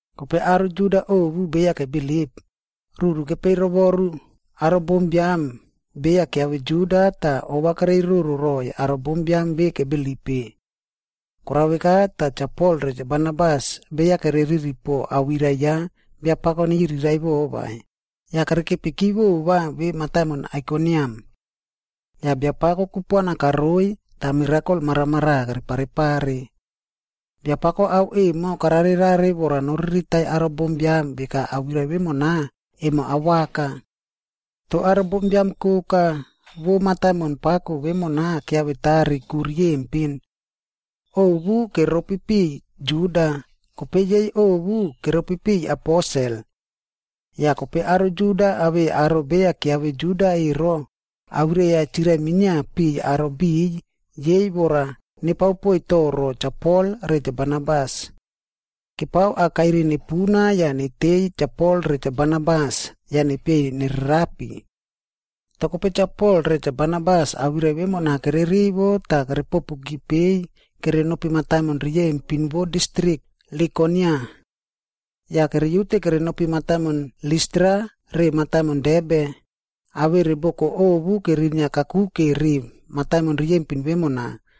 Kope aro Juda ovu beya kebilip, ruru kepeiy rovoru aro bombiam beya kiave Juda tah ova kereiroro roiy aro bombiam ve kebilip-e. Korao veka tah Cha Pol re Cha Barnabas beya kereriri po awirai ya Biapako neyiriraiꞌvo vai, yah kerekepiki vova ve mataimon Aikoniam. Yah Biapako kupuana karoiy tah mirakol maramaraꞌa kereparepare. Biapako ao emo kararerare vora noriritai aro bombiam veka awirai vemona, emo awaka. Toh aro bombiam koka vo mataimon pako vemona kiavetari ku riyempin. Ovu keropi piꞌiy Juda, kope yei ovu keropi piꞌiy aposel. Yah kope aro Juda awei aro beya kiave Juda ero, awirai-a chirai minia piꞌiy aro biꞌiy yei vora nepao poiy toro Cha Pol re Cha Barnabas. Kepao akairi nepuna yah neteiy Cha Pol re Cha Barnabas yah nepieiy nererapi. Toh kope Cha Pol re Cha Barnabas awirai vemona kere rivo tah kerepopuki peiy kerenopi mataimon riyempin vo distrik Likonia. Yah keriute kerenopi mataimon Listra re mataimon Derbe, awere boko ovu kerinia kakuke ri mataimon riyempin vemona,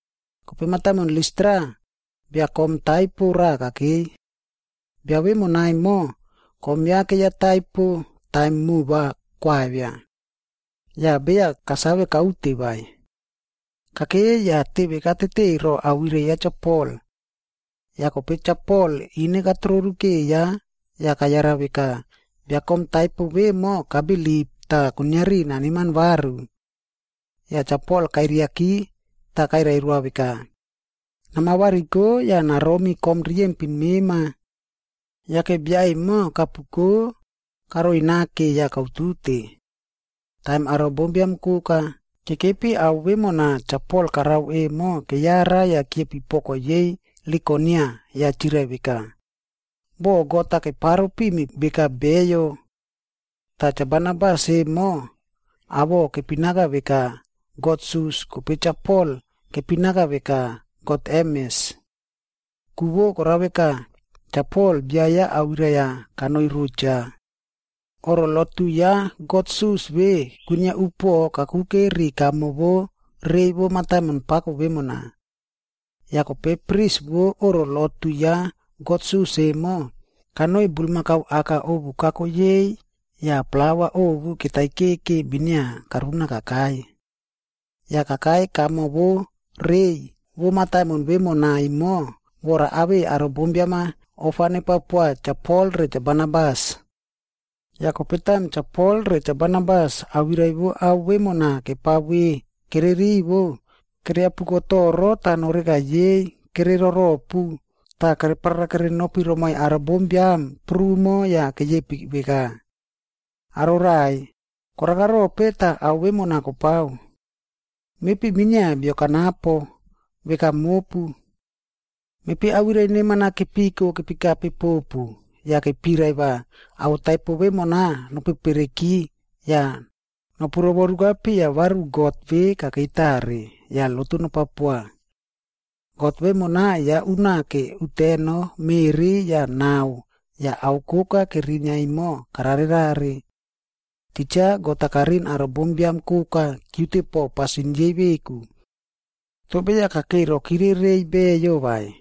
Kope mataimon Listra, bia kom taipo raꞌa kakeiy. Bia vemona emo, kom ya keiya taipo taim moꞌo va koavia. Yah beya kasave kaute vai. Kakei yah teve katete ro awirai ya Cha Pol. Yah kope Cha Pol ine katororu keiya yah kayara veka, bia kom taipo vemo kabilip tah kuiniari naneman varu. Yah Cha Pol kairiaki tah kairai roa veka, “Nama variko yah naromi kom riyempin mema!” Yake bia emo kapuko karoi nake yah kautute. Taim aro bombiam koka kekepi ao vemona Cha Pol karao emo keyara yah kiepi poko yei Likonia yah chirai veka, “Boh god-a keparo pimi veka beyo!” Tah Cha Barnabas emo awoꞌo kepinaka veka god Sus kope Cha Pol kepinaka veka god Hermes.a Ku vo korao veka, Cha Pol bia ya awirai-a kanoi ro cha. Oꞌro lotu ya god Sus ve kwinia upoꞌo kakuke ri kamo vo rei vo mataimon pako vemona. Yah kope pris vo oꞌro lotu ya god Sus emo, kanoi bulmakau aka ovu kako yei yah plaua ovu ketaikeke minia karuna kakai. Yah kakai kamo vo rei vo mataimon vemona emo vora awei aro bombiam-a ofa nepao poa Cha Pol re Cha Barnabas. Yah kope taim Cha Pol re Cha Barnabas awirai vo ao vemona kepao ve kererivo, keriapuko toro tah noreka yei kere roropub tah kere parara kerenopi romoi aro bombiam prumo yah keyepi veka, “Aro raꞌai, koraka rope tah ao vemona kopao? Mepi minia bio kanapo, veka mopu. Mepi awirai neman-a kepiko kepikape popu yah kepirai va ao taipo vemona nopepereki yah nopu rovoruka piya varu God ve kakei tare, yah lotu nopao poa. God vemona ya unake uteno, meꞌri yah nao yah ao koka kerinia emo kararerare. Titja God-a kariꞌin aro bombiam koka kiute po pasin yei veku. Toh beya kakei rokire reiy beyo vai.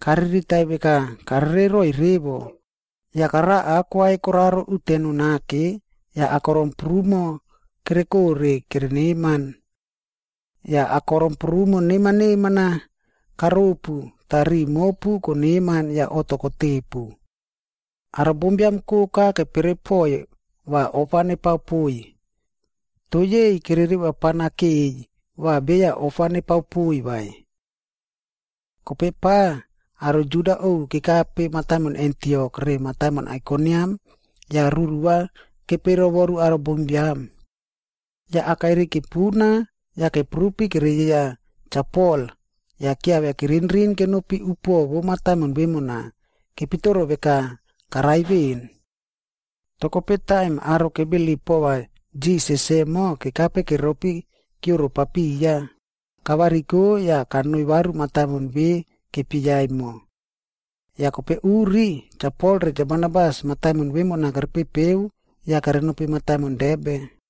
Kariritai veka karere roiy revo, yah karao aꞌ kwai koraro uteno nake yah akorom prumo kerekore kere neman. Yah akorom prumo neman neman-a karopu tah riꞌi mopu koneman yah oꞌto kotepu.” Aro bombiam koka kepere poiy va ofa nepao poiy. Toh yei kere revapana keiy va beya ofa nepao poiy vai. Kope pa aro Juda ovu kekape mataimon Antiok re mataimon Aikoniam yah ruru-a kepeiy rovoru aro bombiam. Yah akairi kepuna tah keprupi kereyieya Cha Pol yah kiavia kerinrin kenopi upuoꞌo vo mataimon vemona, kepitoro veka karai veꞌen. Toh kope taim aro kebilip poa Jisas emo kekape keropi kioro papiya, kavariko yah kanoi varu mataimon ve kepieya emo. Yah kope uri, Cha Pol re Cha Barnabas mataimon vemona kerepepeu yah kerenopi mataimon Derbe.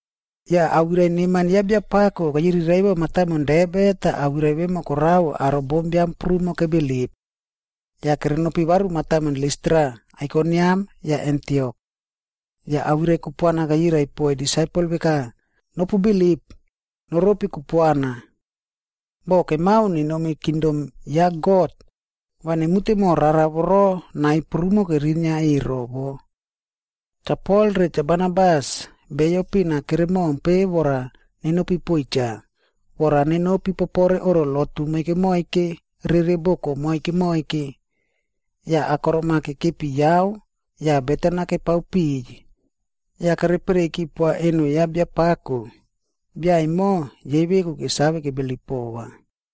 Yah awirai neman ya Biapako keyiriraiꞌvo mataimon Derbe tah awirai vemo korao aro bombiam prumo kebilip. Yah kerenopi varu mataimon Listra, Aikoniam yah Antiok.c Tah awirai kupuana keyirai poiy disaipel veka, “Nopu bilip, noropi kupuana. Boh kemao nenomi kingdom ya God, va nemute mo rara voro nai prumo kerinia ero wo.” Cha Pol re Cha Barnabas beyo pin-a kere mompe vora nenopi poiy cha, vora nenopi popore oꞌro lotu moike moike rere boko moike moike. Yah akorom-a kekepi yao yah beten-a kepao piꞌiy yah kepereiyki poa eno ya Biapako, bia emo yei veku kesave kebilip pova.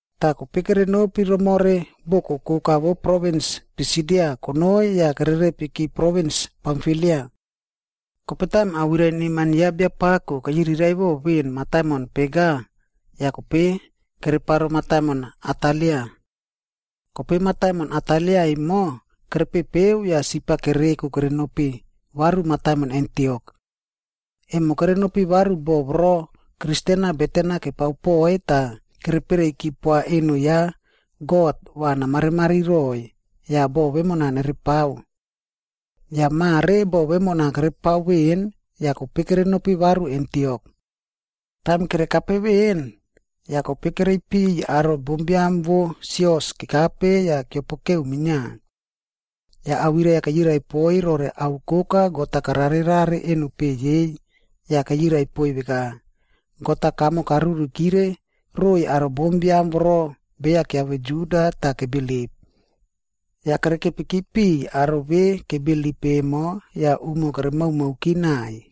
Tah kope kerenopi romore boko koka vo provins Pisidia konoi yah kererepiki provins Pamfilia. Kope taim awirai neman ya Biapako keyiriraiꞌvo veꞌen mataimon Perga, yah kope kereparo mataimon Atalia. Kope mataimon Atalia emo kerepepeu yah sip-a kereko kerenopi varu mataimon Antiok. Emo kerenopi varu bo voro Kristen-a beten-a kepao poiy tah kepereiyki poa eno ya God va namarimari roiy, yah boꞌo vemona nerepao. Yah mare boꞌo vemona kerepao veꞌen yah kope kerenopi varu Antiok. Taim kerekape veꞌen, yah kope kereipiy aro bombiam vo sios kekape yah keopokeu minia. Yah awirai-a keyirai poiy rore ao koka God-a kararerare eno peꞌe yei, yah keyirai poiy veka, “God-a kamo karurikire roiy aro bombiam voro beya kiave Juda tah kebilip.” Yah kerekepiki piꞌiy aro ve kebilip emo yah umo keremaomaoki naiy.